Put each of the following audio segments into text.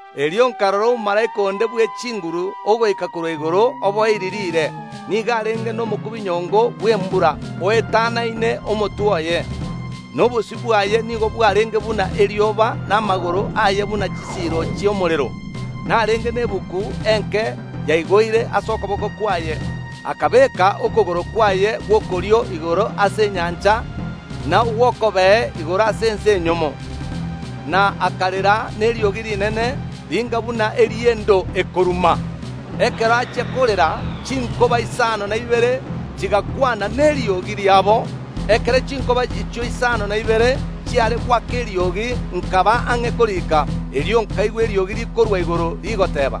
Erio nkarora omomalaika onde bw’echinguru ogoika korwa igoro oboirie riire. Nigo arenge nomokubinyongo bw’embura oetanaine omotwe oye, na obosio bwaye nigo bwarenge buna erioba, na amagoro aye buna chisiiro chi’omorero. Narenge na egetabu egeke kiaigoire ase okoboko kwaye. Akabeka okogoro kwaye gw’okorio igoro ase enyancha na ogw’okobee igoro ase ense enyomo, na akarera neriogi rinene ringa buna eri’endo ekoruma. Ekero achia korera chinkoba isano na ibere chigakwana neriogi riabo. Ekero chinkoba echio isano na ibere chiare goaka eriogi nkaba ang’e korika. Erio nkaigwa eriogi rikorwa igoro rigoteeba,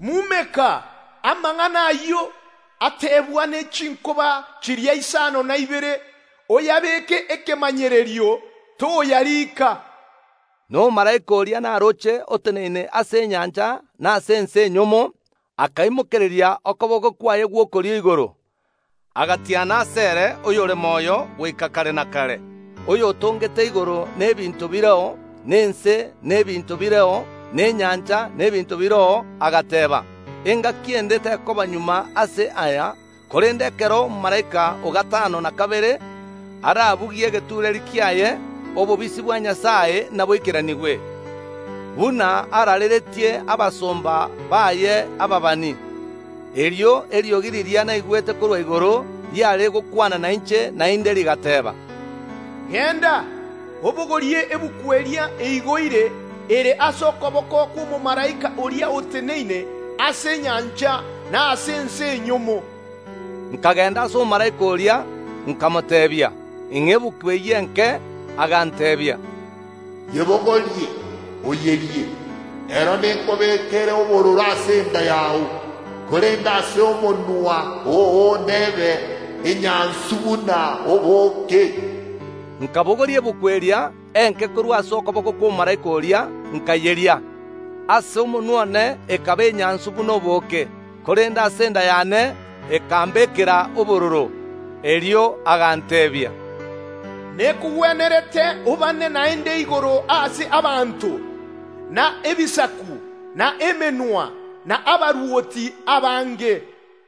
“Mumeka amang’ana ayio atebwa ne chinkoba chiria isano na ibere, oyabeeke ekemanyerio, toyariika.” Na omomalaika oria naroche oteneine ase enyancha na ase ense enyomo akaimokereria okoboko kwaye gw’okorio igoro, agatiana asere oyore moyo goika kare na kare, oyotongete igoro na ebinto bireo, na ense na ebinto bireo, na enyancha na ebinto bireo, agateeba, “Engaki ende tekoba magega ase aya, korende ekero omomalaika o gatano na kabere arabugie egetureeri kiaye, obobisi bwa Nyasae naboikeranigwe, buna araareretie abasomba baye ababani.” Erio eriogi riria naigwete korwa igoro riare gokwana nainche naende, rigateba, “Genda, obogorie egetabu eria eigoire ere ase okoboko kw’omomalaika oria oteneine ase enyancha na ase ense enyomo.” Nkagenda ase omomalaika oria nkamoteebia, “Ing’a egetabu eyio enke.” Aganteebia, “Yebogorie, oyerie; ero nekobekere obororo ase enda yao, korende ase omonwa oo nebe enyansu buna obooke.” Nkabogoria egetabu eria enke korwa ase okoboko kw’omomalaika oria, nkayeria. Ase omonwa one ekaba enyansu buna obooke, korende ase enda yane ekambekera obororo. Erio aganteebia, “Nekogwenerete obaane naende igoro ase abanto, na ebisaku, na emenwa, na abarwoti abange.”